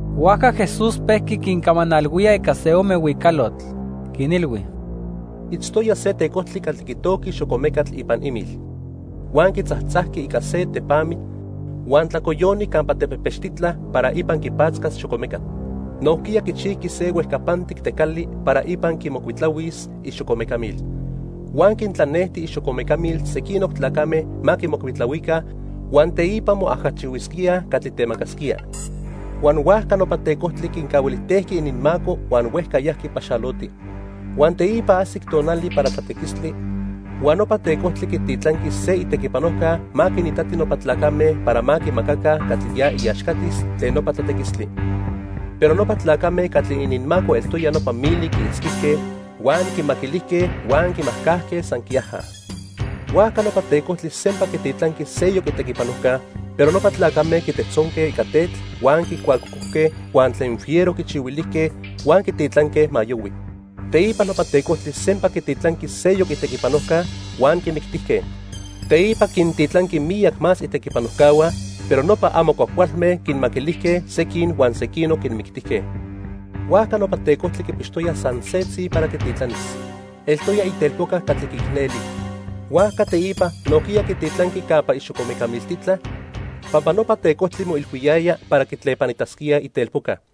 Huajca Jesús pejqui quincamanalhuía ica se ome huicalotl. Quinilhui: "Itztoya se tecojtli catli quitojqui xocomecatl ipan imil. Huan quitzajtzajqui ica se tepamitl huan tlacoyoni campa tepejpechtitla para ipan quipatzcas xocomecatl. Nojquiya quichijqui se huejcapantic tecali para ipan quimocuitlahuis ixocomecamil. Huan quintlanejti ixocomecamil sequinoc tlacame ma quimocuitlahuica huan teipa moajachihuisquíaj catli temacasquía. Huan huajca nopa tecojtli quincahuilijtejqui ininmaco huan huejca yajqui paxaloti. Huan teipa ajsic tonali para tlatequistli, huan nopa tecojtli quititlanqui se itequipanojca ma quinitati nopa tlacame para ma quimacaca catli ya iaxcatis tlen nopa tlatequistli. Pero nopa tlacame catli ininmaco eltoya nopa mili quiitzquijque, huan quimaquilijque huan quimajcajque san quiaja. Huajca nopa tecojtli sempa quititlanqui seyoc itequipanojca, pero nopa tlacame quitejtzonque ica tetl huan quicuacocojque huan tlen fiero quichihuilijque huan quititlanque ma yohui. Teipa nopa tecojtli sempa quititlanqui seyoc itequipanojca, huan quimictijque. Teipa quintitlanqui miyac más itequipanojcahua, pero nopa amo cuajcualme quinmaquilijque sequin huan sequinoc quinmictijque. "Huajca nopa tecojtli quipixtoya san setzi para quititlanis, eltoya itelpoca catli quiicneli. Huajca teipa nojquiya quititlanqui campa ixocomeca miltitla, pampa nopa tecojtli moilhuiyaya para quitlepanitasquíaj itelpoca.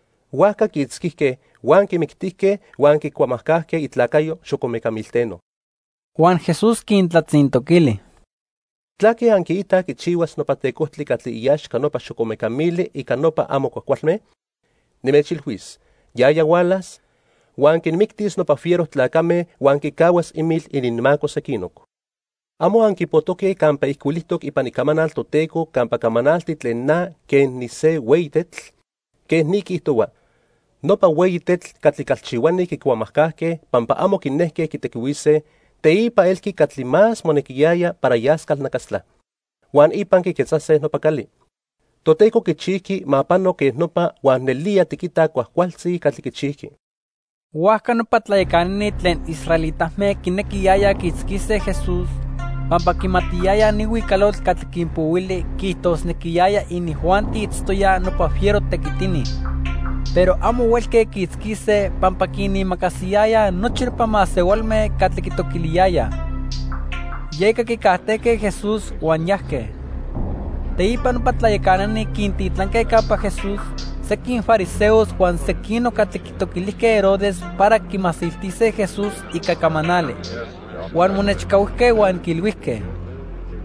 Huajca quiitzquijque, huan quimictijque huan quicuamajcajque itlacayo xocomeca milteno." Huan Jesús quintlatzintoquili: "¿Tlaque anquiitaj quichihuas nopa tecojtli catli iaxca nopa xocomeca mili ica nopa amo cuajcualme? Nimechilhuis, yaya hualas, huan quinmictis nopa fiero tlacame huan quicahuas imil ininmaco sequinoc. ¿Amo anquipojtoque campa ijcuilijtoc ipan Icamanal Toteco campa camanalti tlen na quen nise hueyi tetl? Quej ni quiijtohua: 'Nopa hueyi tetl catli calchihuani quicuamajcajque pampa amo quinejque quitequihuise, teipa elqui catli más monequiyaya para yas calnacastla, huan ipan quiquetzase nopa cali. Toteco quichijqui ma pano quej nopa huan nelía tiquitaj cuajcualtzi catli quichijqui.' " Huajca nopa tlayacanani tlen israelitame quinequiyayaj quiitzquise Jesús pampa quimatiyayaj ni huicalotl catli quinpohuili quiijtosnequiyaya inijuanti itztoyaj nopa fiero tequitini. Pero amo huelque quiitzquise pampa quinimacasiyayaj nochi nopa masehualme catli quitoquiliyayaj. Yeca quicajtejque Jesús huan yajque. Teipa nopa tlayacanani quintitlanque campa Jesús sequin fariseos huan sequinoc catli quitoquilijque Herodes para quimasiltise Jesús ica camanali. Huan monechcahuijque huan quiilhuijque: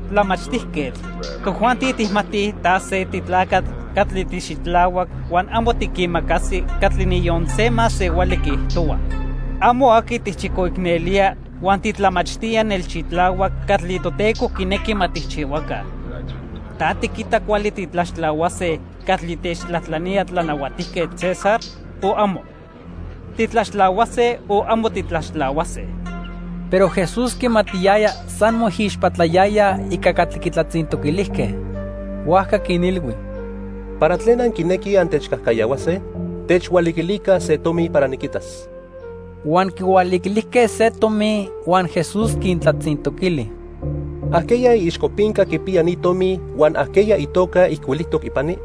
—Tlamachtijquetl, tojuanti tijmatij ta se titlacatl catli tixitlahuac huan amo tiquimacasi catli niyon se masehuali quiijtohua. Amo aqui tijchicoicnelía huan titlamachtía nelxitlahuac catli Toteco quinequi ma tijchihuaca. ¿Ta tiquita cuali titlaxtlahuase catli techtlajtlanía Tlanahuatijquetl César, o amo? ¿Titlaxtlahuase o amo titlaxtlahuase? Pero Jesús quimatiyaya san moijixpatlayayaj ica catli quitlatzintoquilijque. Huajca quinilhui: —¿Para tlen anquinequij antechcajcayahuase? Techhualiquilica se tomi para niquitas. Huan quihualiquilijque se tomi, huan Jesús quintlatzintoquili: —¿Ajqueya iixcopinca quipiya ni tomi huan ajqueya itoca ijcuilijtoc ipani?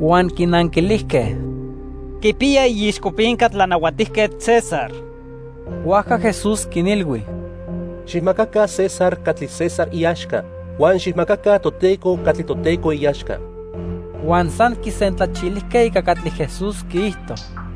Huan quinanquilijque: —Quipiya iixcopinca Tlanahuatijquetl César. Huajca Jesús quinilhui: —Xijmacaca César catli César iaxca, huan xijmacaca Toteco catli Toteco iaxca. Huan san quisentlachilijque ica catli Jesús quiijto.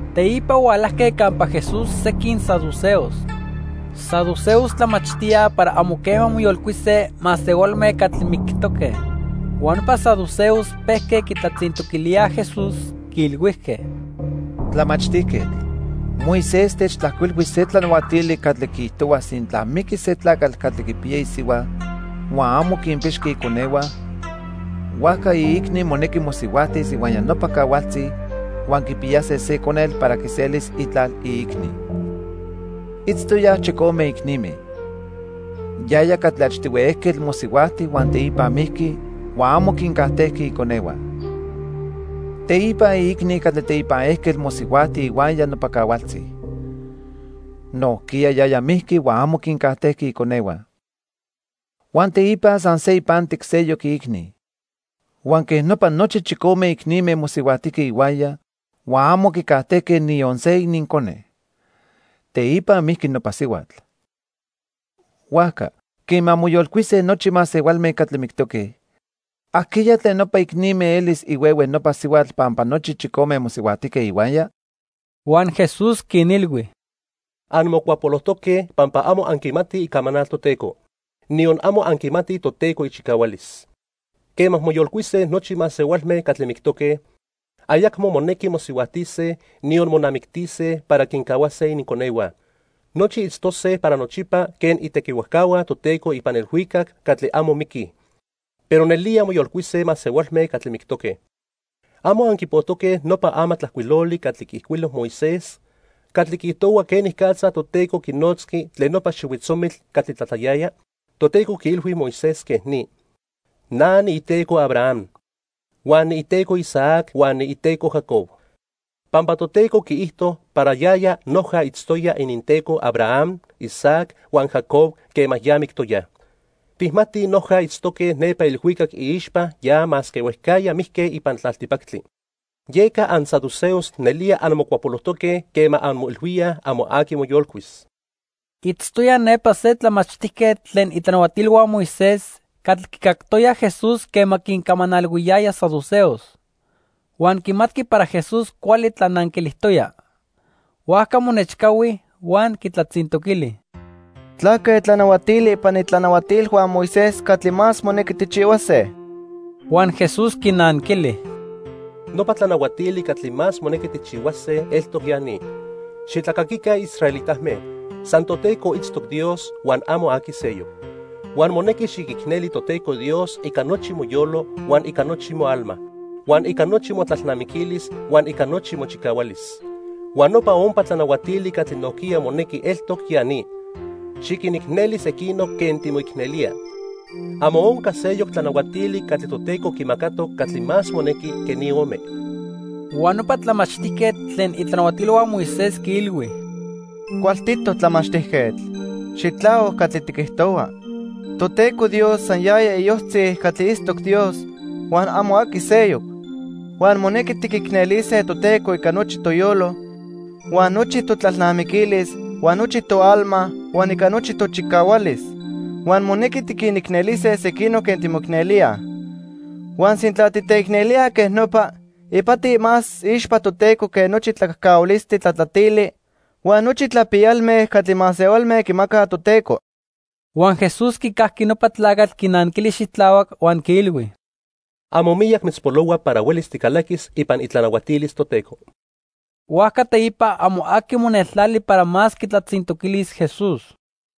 Teipa hualajque campa Jesús sequin saduceos. Saduceos tlamachtíaj para amo quema moyolcuise masehualme catli mictoque. Huan nopa saduceos pejque quitlatzintoquilíaj Jesús, quiilhuijque: —Tlamachtijquetl, Moisés techtlajcuilhui se tlanahuatili catli quiijtohua sintla miquis se tlacatl catli quipiya isihua huan amo quinpixqui ininconehua, huajca iicni monequi mosihuajtis ihuaya nopa cahualtzi huan quipiyase se conetl para quiselis itlal iicni. Itztoyaj chicome icnime. Yaya catli achtihui ejquetl mosihuajti huan teipa mijqui huan amo quincajtejqui iconehua. Teipa iicni catli teipan ejquetl mosihuajti ihuaya nopa cahualtzi. Nojquiya yaya mijqui huan amo quincajtejqui iconehua. Huan teipa san se ipantic seyoc iicni. Huan quej nopa nochi chicome icnime mosihuajtijque ihuaya huan amo quicajtejque niyon se inincone. Teipa mijqui nopa sihuatl. Huajca, quema moyolcuise nochi masehualme catli mictoque, ¿ajqueya tlen nopa icnime elis ihuehue nopa sihuatl pampa nochi chicome mosihuajtijque ihuaya? Huan Jesús quinilhui: —Anmocuapolojtoque pampa amo anquimatij Icamanal Toteco, niyon amo anquimatij Toteco ichicahualis. Quema moyolcuise nochi masehualme catli mictoque, ayacmo monequi mosihuajtise, niyon monamictise para quincahuase ininconehua. Nochi itztose para nochipa quen itequihuajcahua Toteco ipan ilhuicac catli amo miquij. Pero nelía moyolcuise masehualme catli mictoque. ¿Amo anquipojtoque nopa amatlajcuiloli catli quiijcuilo Moisés catli quiijtohua quenicatza Toteco quinotzqui tlen nopa xihuitzomitl catli tlatlayaya? Toteco quiilhui Moisés quej ni: 'Na niiTeco Abraham, huan niiTeco Isaac huan niiTeco Jacob.' Pampa Toteco quiijto para yaya noja itztoya ininTeco Abraham, Isaac, huan Jacob quema ya mictoyaj, tijmatij noja itztoque nepa ilhuicac iixpa ya masque huejcajya mijque ipan tlaltipactli. Yeca ansaduceos nelía anmocuapolojtoque quema anmoilhuíaj amo aqui moyolcuis. Itztoya nepa se tlamachtijquetl tlen itlanahuatilhua Moisés catli quicactoya Jesús quema quincamanalhuiyaya saduceos. Huan quimatqui para Jesús cuali tlananquilijtoya. Huajca monechcahui huan quitlatzintoquili: —¿Tlaque tlanahuatili ipan itlanahuatilhua Moisés catli más monequi tijchihuase? Huan Jesús quinanquili: —Nopa tlanahuatili catli más monequi tijchihuase eltoc ya ni: 'Xitlacaquica israelitame, san Toteco itztoc Dios huan amo aqui seyoc. Huan monequi xiquicneli Toteco Dios ica nochi moyolo huan ica nochi moalma, huan ica nochi motlalnamiquilis huan ica nochi mochicahualis.' Huan nopa ompa tlanahuatili catli nojquiya monequi eltoc ya ni: 'Xiquinicneli sequinoc quen timoicnelía.' Amo onca seyoc tlanahuatili catli Toteco quimacatoc catli más monequi que ni ome. Huan nopa tlamachtijquetl tlen itlanahuatilhua Moisés quiilhui: —Cualtitoc tlamachtijquetl. Xitlahuac catli tiquijtohua. Toteco Dios san yaya iyojtzi catli itztoc Dios, huan amo aqui seyoc. Huan monequi tiquicnelise Toteco ica nochi toyolo, huan nochi totlalnamiquilis, huan nochi toalma huan ica nochi tochicahualis. Huan monequi tiquinicnelise sequinoc quen timoicnelíaj. Huan sintla titeicnelíaj quej nopa, ipati más iixpa Toteco que nochi tlacajcahualistli tlatlatili huan nochi tlapiyalme catli masehualme quimacaj Toteco. Huan Jesús quicajqui nopa tlacatl quinanquili xitlahuac huan quiilhui: —Amo miyac mitzpolohua para huelis ticalaquis ipan itlanahuatilis Toteco. Huajca teipa amo aqui moneltlali para más quitlatzintoquilis Jesús.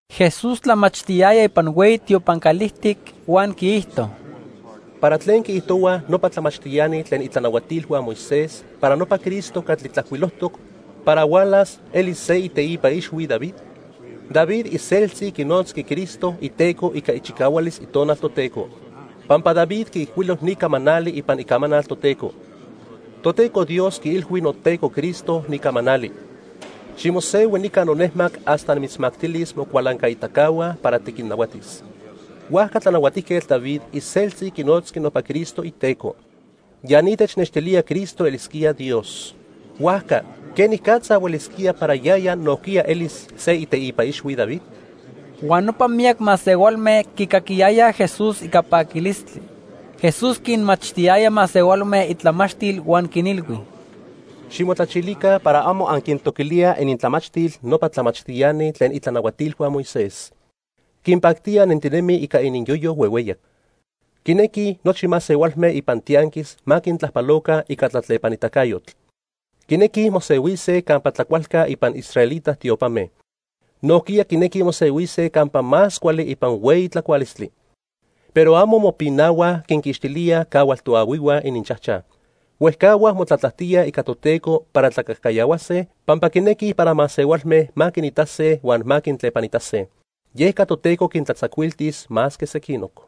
Jesús tlamachtiyaya ipan hueyi tiopan calijtic huan quiijto: —¿Para tlen quiijtohuaj nopa tlamachtiani tlen itlanahuatilhua Moisés para nopa Cristo catli tlajcuilojtoc para hualas elis se iteipa ixhui David? David iseltzi quinotzqui Cristo iTeco ica ichicahualis Itonal Toteco, pampa David quiijcuilo ni camanali ipan Icamanal Toteco: 'Toteco Dios quiilhui noTeco Cristo ni camanali: Ximosehui nica nonejmac hasta nimitzmactilis mocualancaitacahua para tiquinnahuatis.' Huajca Tlanahuatijquetl David iseltzi quinotzqui nopa Cristo iTeco. Ya ni technextilía Cristo elisquía Dios. Huajca ¿quenicatza huelisquía para yaya nojquiya elis se iteipa ixhui David? Huan nopa miyac masehualme quicaquiyayaj Jesús ica paquilistli. Jesús quinmachtiyaya masehualme itlamachtil huan quinilhui: "Ximotlachilica para amo anquintoquilíaj inintlamachtil nopa tlamachtiani tlen itlanahuatilhua Moisés. Quinpactía nentinemij ica ininyoyo huehueyac. Quinequij nochi masehualme ipan tianquis ma quintlajpaloca ica tlatlepanitacayotl. Quinequij mosehuise campa tlacualca ipan israelita tiopame. Nojquiya quinequij mosehuise campa más cuali ipan hueyi tlacualistli. Pero amo mopinahuaj quinquixtilíaj cahual toahuihua ininchajchaj. Huejcahuaj motlatlajtíaj ica Toteco para tlacajcayahuase pampa quinequij para masehualme ma quinitase huan ma quintlepanitase. Yeca Toteco quintlatzacuiltis más que sequinoc."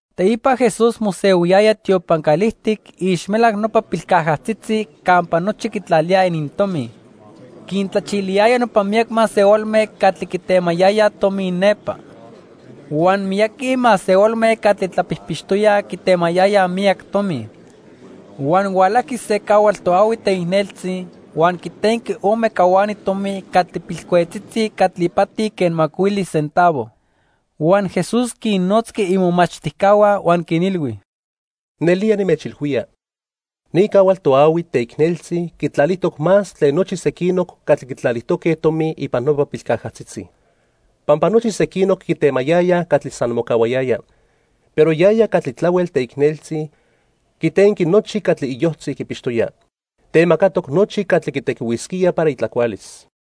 Teipa Jesús mosehuiyaya tiopan calijtic iixmelac nopa pilcajatzitzi campa nochi quitlalíaj inintomi. Quintlachiliyaya nopa miyac masehualme catli quitemayayaj tomi nepa. Huan miyaqui masehualme catli tlapijpixtoyaj quitemayayaj miyac tomi. Huan hualajqui se cahual toahui teicneltzi huan quitenqui ome cahuani tomi catli pilcuejtzitzi catli ipati quen macuili centavo. Huan Jesús quinnotzqui imomachtijcahua huan quinilhui: —Nelía nimechilhuía, ni cahual toahui teicneltzi quitlalijtoc más tlen nochi sequinoc catli quitlalijtoque tomi ipan nopa pilcajatzitzi. Pampa nochi sequinoc quitemayayaj catli san mocahuayaya, pero yaya catli tlahuel teicneltzi, quitenqui nochi catli iyojtzi quipixtoya. Temacatoc nochi catli quitequihuisquía para itlacualis.